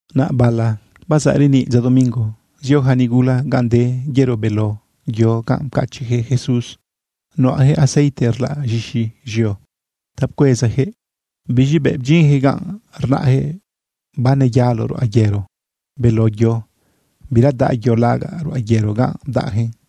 Naꞌ bala bazaꞌ reniꞌ dza domingo, zio yaca nigula ganꞌ de yero beló yo ganꞌ pcachiꞌyaquëꞌ Jesús. Nuꞌayaquëꞌ aceite rlaꞌ z̃ixi z̃eo ta pcuezayaquëꞌ. Biz̃i bëꞌ bdyinyaquëꞌ ganꞌ, rnaꞌyaquëꞌ baneyalo ruꞌa yero beló yo. Bira daꞌ yo lagaꞌ ruꞌa yero ganꞌ bdaꞌyaquëꞌn.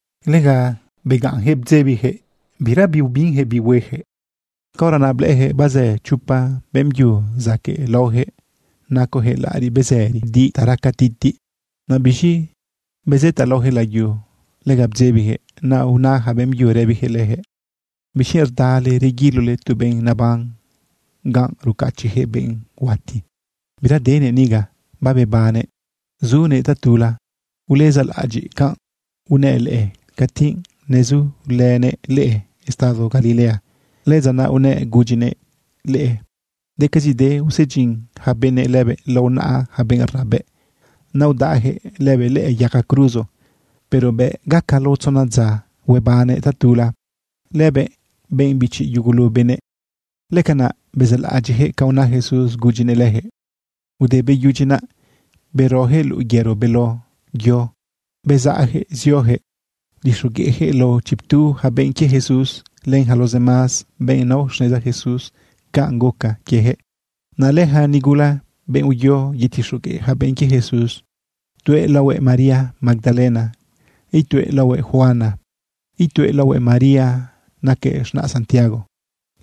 Lega begaꞌnyaquëꞌ bdzebiyaquëꞌ. Bira biubinyaquëꞌ bi hueyaquëꞌ. Caora naꞌ blëꞌëyaquëꞌ bazë chopa beꞌmbyu zaquëꞌ laoyaquëꞌ nacoyaquëꞌ laꞌariꞌ bezëri di ta raca titiꞌ. Naꞌ biz̃i bezëtaꞌ laoyaquëꞌ layu, lega bdzebiyaquëꞌ. Naꞌ una yaca beꞌmbyu rëbiyaquëꞌ leyaquëꞌ: ―¿Bixquienꞌ rdale reguilole tu benꞌ naban ganꞌ rucachiꞌyaquëꞌ benꞌ huati? Bira denëꞌ niga. Babebannëꞌ zunëꞌ tatula. Ulezaꞌlaꞌadyiꞌ canꞌ unëꞌ leꞌe cati nezulënëꞌ leꞌe estado Galilea. Lëdza naꞌ unëꞌ gudyinëꞌ leꞌe decazide usedyin yaca benëꞌ lëbëꞌ lao naꞌa yaca benꞌ rnabëꞌ, naꞌ udaꞌyaquëꞌ lëbëꞌ lëꞌë yaga cruzo, pero bëꞌ gaca lao tzona dza, huebannëꞌ tatula lëbëꞌ, benꞌ bichi yugulu benëꞌ. Lëcanaꞌ bezaꞌlaꞌadyiꞌyaquëꞌ ca una Jesús gudyinëꞌ leyaquëꞌ. Ude beyudyi naꞌ, beroyaquëꞌ luꞌu yero beló yo bezaꞌyaquëꞌ zioyaquëꞌ udixogueꞌyaquëꞌ lao chiptu yaca benꞌ quie Jesús, len yaca los demás benꞌ nao xneza Jesús canꞌ guca quieyaquëꞌ. Naꞌ lëyaca nigula, benꞌ uyo yetixogueꞌ yaca benꞌ quie Jesús, tuëꞌ laohuëꞌ María Magdalena, ituëꞌ laohuëꞌ Juana, ituëꞌ laohuëꞌ María, naquëꞌ z̃naꞌ Santiago.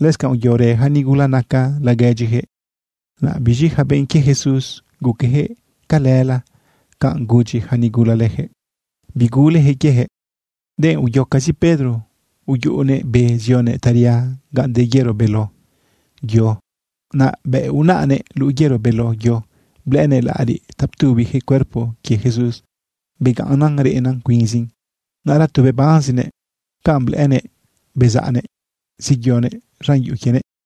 Lëscanꞌ uyorë yaca nigula naca laguedyiyaquëꞌ. Naꞌ biz̃i yaca benꞌ quie Jesús guqueyaquëꞌ calëla canꞌ gudyi yaca nigula leyaquëꞌ. Biguleyaquëꞌ quieyaquëꞌ. Denꞌ uyocazi Pedro uyuꞌunëꞌ be zionëꞌ taria ganꞌ de yero beló yo. Naꞌ bëꞌ unaꞌnëꞌ luꞌu yero beló yo, blëꞌënëꞌ laꞌariꞌ ta ptubiyaquëꞌ cuerpo quie Jesús, begaꞌnnan reꞌnan cuinzin. Naꞌra tu bebanzinëꞌ canꞌ blëꞌënëꞌ bezaꞌnëꞌ zeyoguëꞌ z̃an yuꞌu quienëꞌ.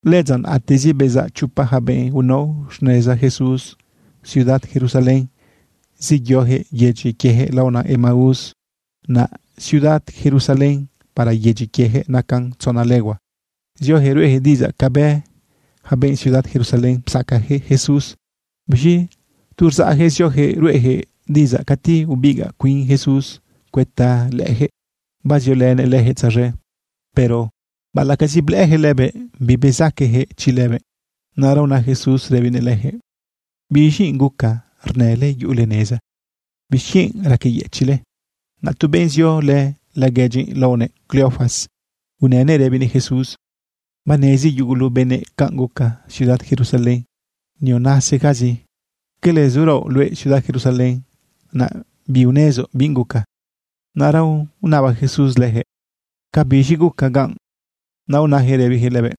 Lëdza naꞌatezi, bezaꞌ chopa yaca benꞌ unao xneza Jesús ciudad Jerusalén, zeyoyaquëꞌ yedyi quieyaquëꞌ laona Emaús. Naꞌ ciudad Jerusalén para yedyi quieyaquëꞌ nacan tzona legua. Zioyaquëꞌ ruꞌeyaquëꞌ diꞌidzaꞌ ca bë yaca benꞌ ciudad Jerusalén psacayaquëꞌ Jesús. Biz̃i tu rzaꞌyaquëꞌ zioyaquëꞌ ruꞌeyaquëꞌ diꞌidzaꞌ, cati ubigaꞌ cuin Jesús cuëta leyaquëꞌ baziolënëꞌ leyaquëꞌ tzaz̃e. Pero baꞌalaꞌcazi blëꞌëyaquëꞌ lëbëꞌ, bibezaqueyaquëꞌ chi lëbëꞌ. Naꞌra una Jesús rëbinëꞌ leyaquëꞌ: ―¿Biz̃i guca rnële yuꞌule neza? ¿Bixquienꞌ raqueyëchiꞌle? Naꞌ tu benꞌ ziolë laguedyi laonëꞌ Cleofas unënëꞌ rëbinëꞌ Jesús: ―Banezi yugulu benëꞌ canꞌ guca ciudad Jerusalén nionasigazi. ¿Cala zuraoꞌ luëꞌ ciudad Jerusalén, naꞌ biunezoꞌ binꞌ guca? Naꞌra unaba Jesús leyaquëꞌ: ―¿Cabiz̃i guca ganꞌ? Naꞌ unayaquëꞌ rëbiyaquëꞌ lëbëꞌ: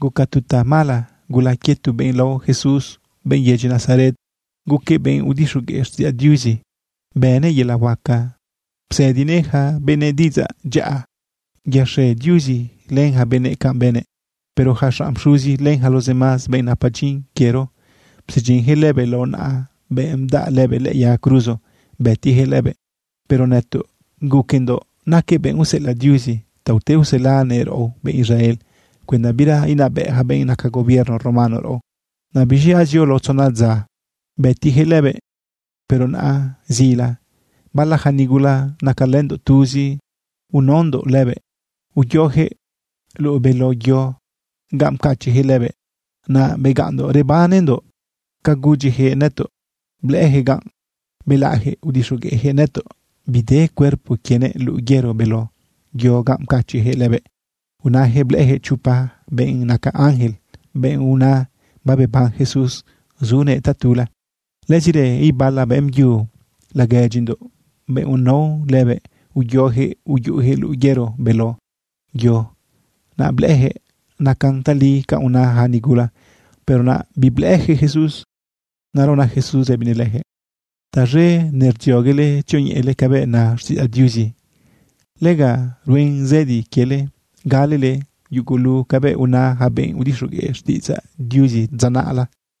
―Guca tu tamala gula quie tu benꞌ lao Jesús, benꞌ yedyi Nazaret. Guquëꞌ benꞌ udixogueꞌ xtiꞌidzaꞌ Diuzi. Bënëꞌ yelaꞌ huaca, psëdinëꞌ yaca benëꞌ diꞌidzaꞌ dyaꞌa. Yaxe Diuzi len yaca benëꞌ canꞌ bënëꞌ. Pero yaca xanꞌ pxuzi, len yaca los demás benꞌ napa dyin quiero, psedyinyaquëꞌ lëbëꞌ lao naꞌa benꞌ bdaꞌ lëbëꞌ lëꞌë yaga cruzo bëtiyaquëꞌ lëbëꞌ. Pero nëtoꞌ guquendoꞌ naquëꞌ benꞌ useꞌelaꞌ Diuzi ta ute uselanëꞌ raꞌo benꞌ Israel cuenda bira inabëꞌ yaca benꞌ naca gobierno romano raꞌo. Naꞌ biz̃i azio lao tzona dza bëtiyaquëꞌ lëbëꞌ. Pero naꞌa zila, bala yaca nigula nacalëndoꞌ tuzi unaondoꞌ lëbëꞌ, uyoyaquëꞌ luꞌu beló yo ganꞌ pcachiꞌyaquëꞌ lëbëꞌ. Naꞌ begaꞌnndoꞌ rebanendoꞌ ca gudyiyaquëꞌ nëtoꞌ blëꞌëyaquëꞌ ganꞌ. Belaꞌyaquëꞌ udixogueꞌyaquëꞌ nëtoꞌ bide cuerpo quienëꞌ luꞌu yero beló yo ganꞌ pcachiꞌyaquëꞌ lëbëꞌ. Unayaquëꞌ blëꞌëyaquëꞌ chopa benꞌ naca ángel, benꞌ una babeban Jesús zunëꞌ tatula. Lëzirë ibala beꞌmbyu laguedyindoꞌ, benꞌ unao lëbëꞌ, uyoyaquëꞌ uyuꞌuyaquëꞌ luꞌu yero beló yo, naꞌ blëꞌëyaquëꞌ nacan tali canꞌ una yaca nigula, pero naꞌ biblëꞌëyaquëꞌ Jesús. Naꞌra una Jesús rëbinëꞌ leyaquëꞌ: ―Taz̃e nerdzioguele tzioñeꞌele cabëꞌ na xtiꞌidzaꞌ Diuzi. Lega ruen zëdi quiele galele yugulu cabëꞌ una yaca benꞌ udixogueꞌ xtiꞌidzaꞌ Diuzi dza naꞌla.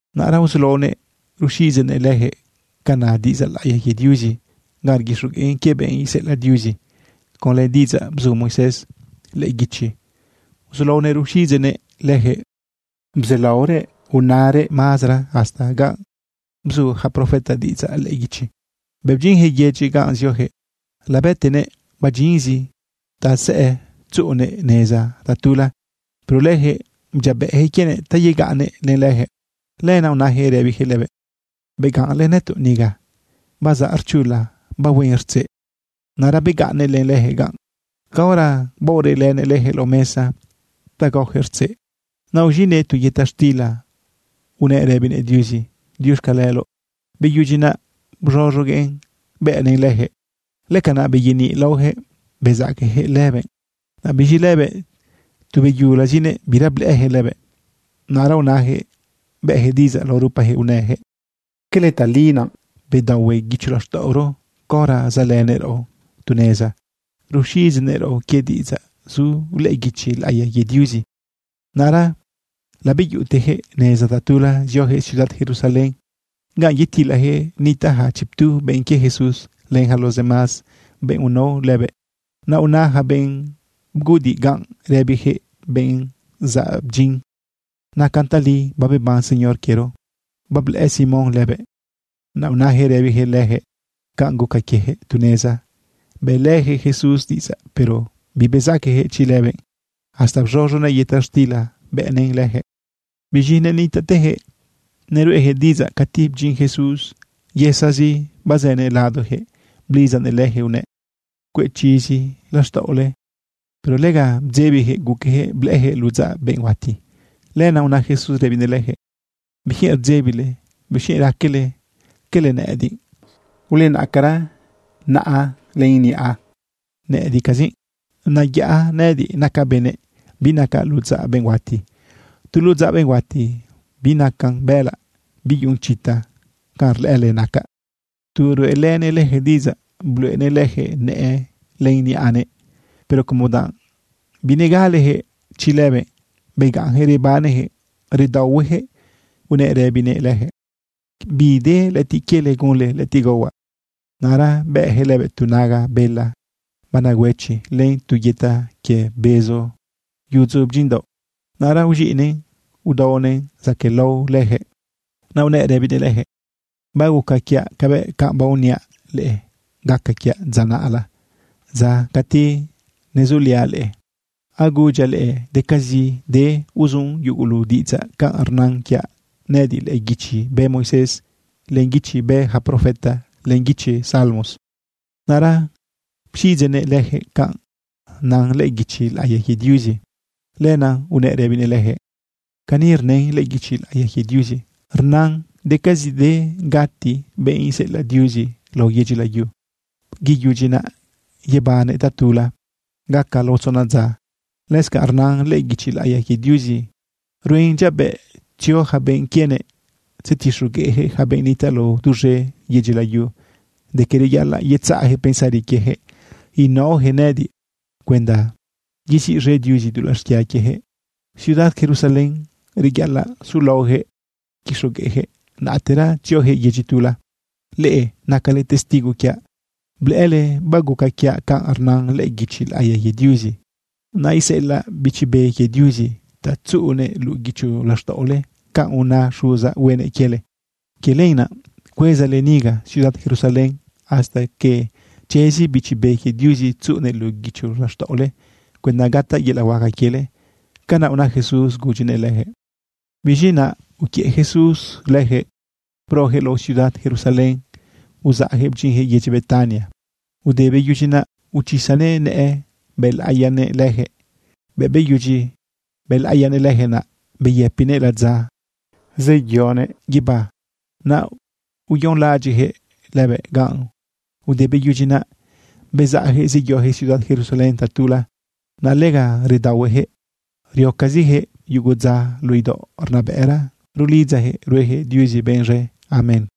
Naꞌra uzulaonëꞌ ruxiꞌidzeꞌnëꞌ leyaquëꞌ ca na diꞌidzaꞌ laꞌiya quie Diuzi ganꞌ rguixogueꞌn quie benꞌ iseꞌelaꞌ Diuzi. Conlë diꞌidzaꞌ bzu Moisés lëꞌë guichi uzulaonëꞌ ruxiꞌidzeꞌnëꞌ leyaquëꞌ, bzalaorëꞌ unarëꞌ mazara hasta ganꞌ bzu yaca profeta diꞌidzaꞌ lëꞌë guichi. Bëꞌ bdyinyaquëꞌ yedyi ganꞌ zioyaquëꞌ, labëtenëꞌ badyinzi ta sëꞌë tzuꞌunëꞌ neza tatula. Pero leyaquëꞌ bdyiabëꞌyaquëꞌ quienëꞌ ta yegaꞌnnëꞌ len leyaquëꞌ. Lenaꞌ unayaquëꞌ rëbiyaquëꞌ lëbëꞌ: ―Begaꞌnlë nëtoꞌ niga. Bazaꞌ rchula bahuen rtzeꞌ. Naꞌra begaꞌnnëꞌ len leyaquëꞌ ganꞌ. Caora baoreꞌlënëꞌ leyaquëꞌ lao mesa ta gaoyaquëꞌ rtzeꞌ, naꞌ uz̃iꞌnëꞌ tu yëta xtila unëꞌ rëbinëꞌ Diuzi diuxcaleloꞌ. Beyudyi naꞌ, bz̃oz̃oguëꞌn bëꞌnëꞌn leyaquëꞌ. Lëcanaꞌ beyeniꞌ laoyaquëꞌ bezaqueyaquëꞌ lëbëꞌ. Naꞌ biz̃i lëbëꞌ tu beyulazinëꞌ, bira blëꞌëyaquëꞌ lëbëꞌ. Naꞌra unayaquëꞌ bëꞌyaquëꞌ diꞌidzaꞌ lao rupayaquëꞌ unëyaquëꞌ: ―¿Cala tali naꞌ bedaohue guicho laxtaꞌoro caora zaꞌlënëꞌ raꞌo tu neza ruxiꞌidzeꞌnëꞌ raꞌo quie diꞌidzaꞌ zu lëꞌë guichi laꞌiya quie Diuzi? Naꞌra labeyuꞌuteyaquëꞌ neza tatula, zioyaquëꞌ ciudad Jerusalén ganꞌ yetilayaquëꞌ nitaꞌ yaca chiptu benꞌ quie Jesús, len yaca los demás benꞌ unao lëbëꞌ. Naꞌ una yaca benꞌ bguꞌudiꞌ ganꞌ, rëbiyaquëꞌ benꞌ zabdyin: ―Nacan tali babeban Señor quiero. Bablëꞌë Simón lëbëꞌ. Naꞌ unayaquëꞌ rëbiyaquëꞌ leyaquëꞌ canꞌ guca quieyaquëꞌ tu neza bëꞌlëyaquëꞌ Jesús diꞌidzaꞌ, pero bibezaqueyaquëꞌ chi lëbëꞌ hasta bz̃oz̃onëꞌ yëta xtila bëꞌnëꞌn leyaquëꞌ. Biz̃i nenitaꞌteyaquëꞌ neruꞌeyaquëꞌ diꞌidzaꞌ cati bdyin Jesús yësazi bazënëꞌ ladoyaquëꞌ blidzanëꞌ leyaquëꞌunëꞌ: ―Cueꞌ chizi laxtaꞌole. Pero lega bdzebiyaquëꞌ guqueyaquëꞌ blëꞌëyaquëꞌ ludzaꞌ benꞌ huati. Lenaꞌ una Jesús rëbinëꞌ leyaquëꞌ: ―¿Bixquienꞌ rdzebile? ¿Bixquienꞌ raquele cala nëꞌëdiꞌ? Ulenaꞌcara naꞌa len niꞌa, nëꞌëdiꞌcazi. Neyaꞌa nëꞌëdiꞌ nacaꞌ benëꞌ, binacaꞌ ludzaꞌ benꞌ huati. Tu ludzaꞌ benꞌ huati binacan bëꞌëlaꞌ, biyuꞌun chita canꞌ rlëꞌële nacaꞌ. Tu ruꞌelënëꞌ leyaquëꞌ diꞌidzaꞌ, bluꞌenëꞌ leyaquëꞌ nëꞌë len niꞌanëꞌ. Pero como danꞌ binegaleyaquëꞌ chi lëbëꞌ, begaꞌnyaquëꞌ rebaneyaquëꞌ redaohueyaquëꞌ, unëꞌ rëbinëꞌ leyaquëꞌ: ―¿Bide lëꞌëtiꞌ quiele gunle lëꞌëtiꞌ gaohuaꞌ? Naꞌra bëꞌyaquëꞌ lëbëꞌ tu naga bela banegüechi len tu yëta quie bezo yudzu bdyinꞌdaoꞌ. Naꞌra uz̃iꞌnëꞌn udaonëꞌn zaquëꞌlao leyaquëꞌ. Naꞌ unëꞌ rëbinëꞌ leyaquëꞌ: ―Baguca quiaꞌ cabëꞌ canꞌ baoniaꞌ leꞌe gaca quiaꞌ dza naꞌla, dza cati nezuliaꞌ leꞌe. Agudyaꞌ leꞌe decazide uzun yugulu diꞌidzaꞌ canꞌ rnan quiaꞌ nëꞌëdiꞌ lëꞌë guichi bë Moisés, len guichi bë yaca profeta, len guichi Salmos. Naꞌra pxiꞌidzeꞌnëꞌ leyaquëꞌ canꞌ na lëꞌë guichi laꞌiya quie Diuzi. Lenaꞌ unëꞌ rëbinëꞌ leyaquëꞌ: ―Cani rnën lëꞌë guichi laꞌiya quie Diuzi. Rnan decazide gati benꞌ iseꞌelaꞌ Diuzi lao yedyi layu. Te beyudyi naꞌ, yebannëꞌ tatula gaca lao tzona dza. Lëscanꞌ rnan lëꞌë guichi laꞌiya quie Diuzi ruen dyiabëꞌ tzio yaca benꞌ quienëꞌ tzetixogueꞌyaquëꞌ yaca benꞌ nitaꞌ lao duz̃e yedyi layu de que reyaꞌalaꞌ yetzaꞌyaquëꞌ pensari quieyaquëꞌ inaoyaquëꞌ nëꞌëdiꞌ cuenda yeziꞌz̃e Diuzi dulaꞌ xquia quieyaquëꞌ. Ciudad Jerusalén reyaꞌalaꞌ sulaoyaquëꞌ quixogueꞌyaquëꞌ, naꞌtera tzioyaquëꞌ yedyi tula. Leꞌe nacale testigo quiaꞌ blëꞌële baguca quiaꞌ canꞌ rnan lëꞌë guichi laꞌiya quie Diuzi. Naꞌ iseꞌelaꞌ Bichi Be quie Diuzi ta tzuꞌunëꞌ luꞌu guicho laxtaꞌole canꞌ una Xuzaꞌ huenëꞌ quiele. Quie lenaꞌ cuezale niga ciudad Jerusalén hasta que chezi Bichi Be quie Diuzi tzuꞌunëꞌ luꞌu guicho laxtaꞌole cuenda gataꞌ yelaꞌ huaca quiele. ―Canaꞌ una Jesús gudyinëꞌ leyaquëꞌ. Biz̃i naꞌ uquiëꞌ Jesús leyaquëꞌ broyaquëꞌ lao ciudad Jerusalén uzaꞌyaquëꞌ bdyinyaquëꞌ yedyi Betania. Ude beyudyi naꞌ, uchisanëꞌ nëꞌë bëlaꞌiyanëꞌ leyaquëꞌ. Bëꞌ beyudyi bëlaꞌiyanëꞌ leyaquëꞌ, naꞌ beyëpinëꞌ ladza yeyonëꞌ guibá. Naꞌ uyonlaꞌadyiꞌyaquëꞌ lëbëꞌ ganꞌ. Ude beyudyi naꞌ, bezaꞌyaquëꞌ zeyoyaquëꞌ ciudad Jerusalén tatula. Naꞌ lega redaohueyaquëꞌ, riocaziyaquëꞌ yugu dza luꞌu idaoꞌ rnabëꞌra rulidzayaquëꞌ rueyaquëꞌ Diuzi benꞌ z̃e. Amén.